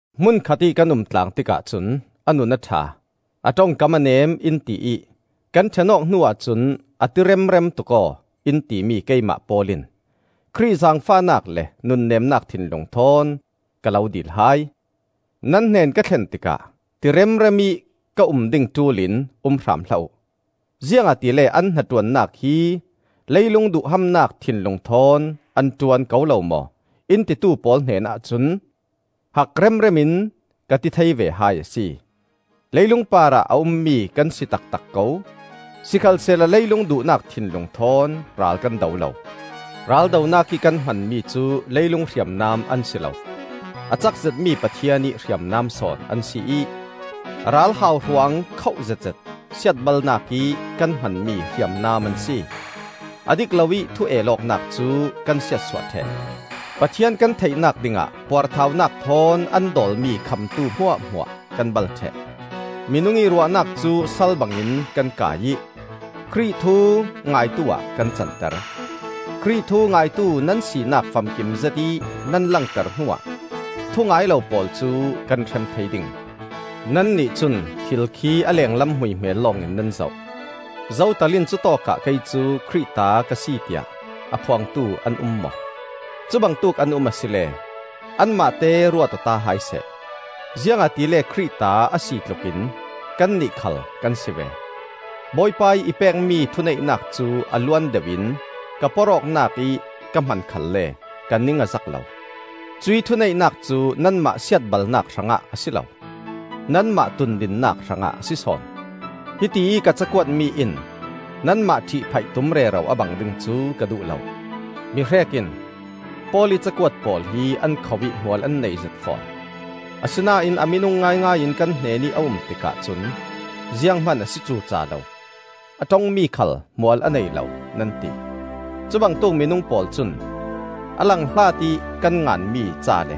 Hmun khatih kan umtlang tikah cun a nun a ṭha, a ṭongkam a neem in ti ih kan ṭhen-awk hnu ahcun a ti remrem tuk aw, in timi keimah Paul in Khrih zaangfahnak le nunneemnak thinlung thawn, ka lo dil hai: Nan hnen ka thlen tikah ti remrem ih ka um ding ṭul in um hram hlah uh. Ziangahtile an hnaṭuannak hi leilung duhhamnak thinlung thawn an ṭuan ko lo maw, in titu pawl hnenah cun hak remrem in ka ti thei ve hai a si. Leilung parah a ummi kan si taktak ko; sikhalsehla leilung duhnak thinlung thawn ral kan do lo. Raldonak ih kan hmanmi cu leilung hriamnam an si lo; a cak zetmi Pathian ih hriamnam sawn an si ih ral hauhruang khoh zetzet siatbalnak ih kan hmanmi hriamnam an si. A dik loih thu el awknak cu kan siatsuah ṭheh, Pathian kan theihnak dingah puarthaunak thawn an dawlmi khamtu hmuahhmuah kan bal ṭheh; minung ih ruahnak cu sal bangin kan kai ih Khrih thu ngaitu-ah kan canter. Khrih thu ngaitu nan sinak famkim zetih nan langter hnuah thu ngai lo pawl cu kan hrem thei ding. Nannih cun thil khi a lenglam hmuihmel lawngin nan zoh. Zotal in cutawkah kei cu Khrih ta ka si tiah a phuangtu an um maw? Cubangtuk an um asile anmahte ruat-awta hai seh; ziangahtile Khrih ta a si tlukin kannih khal kan si ve. Bawipa ih i pekmi thuneihnak cu a luan deuhin ka porhawknak ih ka hman khalle ka ning a zak lo; cuih thuneihnak cu nanmah siatbalnak hrangah a si lo, nanmah tundinnak hrangah a si sawn. Hitiih ka cakuatmi in nanmah ṭhihphaih tum rero a bang ding cu ka duh lo. Mihrek in, “Paul ih cakuat pawl hi an khoh ih hmual an neizet fawn; asinain a minung ngaingai in kan hnenih a um tikah cun zianghman a si cuca lo, a ṭongmi khal hmual a nei lo,” nan ti. Cubangtuk minung pawl cun a lang hlat ih kan nganmi ca le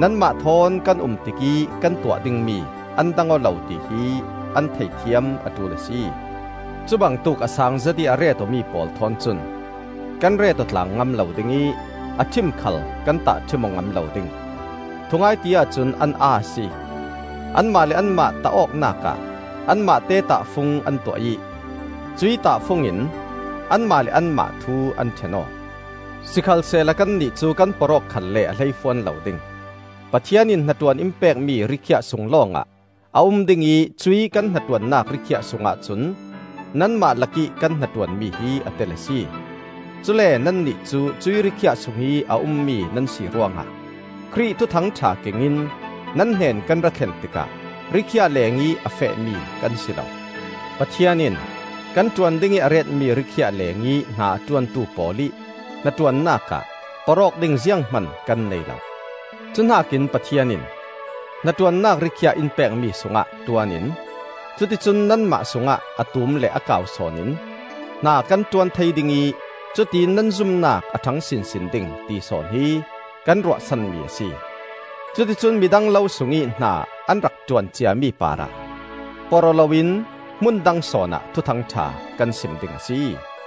nanmah thawn kan um tikih kan tuah dingmi an dang aw lo tihi an theihthiam a ṭul a si. Cubangtuk a saang zetih a ret-awmi pawl thawn cun kan ret-aw tlang ngam lo ding ih a ṭhim khal kan tahṭhim aw ngam lo ding. Thungai ti-ah cun an aa a si! Anmah le anmah tah awknak ah anmahte tahfung an tuah ih cuih tahfung in anmah le anmah thu an ṭhen aw. Sikhalsehla kannih cu kan porh awk khalle a hleifuan lo ding; Pathian in hnaṭuan in pekmi ri-khiah sung lawngah a um ding ih cuih kan hnaṭuannak rikhiah sungah cun nanmah lakih kan hnaṭuanmi hi a tel a si. Cule nannih cu cuih rikhiah sungih a ummi nan si ruangah Khrih Thuthang ṭha kengin nan hnen kan rathlen tikah rikhiah lengih a fehmi kan si lo. Pathian in kan ṭuan dingih a retmi rikhiah lengih hna a ṭuantu pawl ih hnaṭuannak ah porh awk ding zianghman kan nei lo. Cuhnakin Pathian in hnaṭuannak rikhiah in pekmi sungah ṭuan in cuticun nanmah sungah a tum le a kau sawn in hna kan ṭuan thei ding ih cutiin nan zumnak a ṭhang sinsin ding ti sawn hi kan ruahsanmi a si. Cuticun midang lo sungih hna an rak ṭuan ciami parah porh aw loin hmundang sawnah Thuthangṭha kan sim ding a si.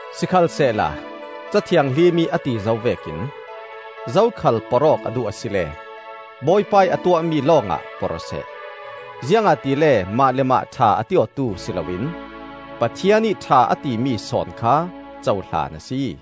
Sikhalsehla Ca Thianghlim ih a ti zo vekin: “Zokhal porh awk a duh asile Bawipa ih a tuahmi lawngah porh-aw seh.” Ziangahtile mah le mah ṭha a ti awtu si loin Pathian ih ṭha a timi sawn kha cohlan a si.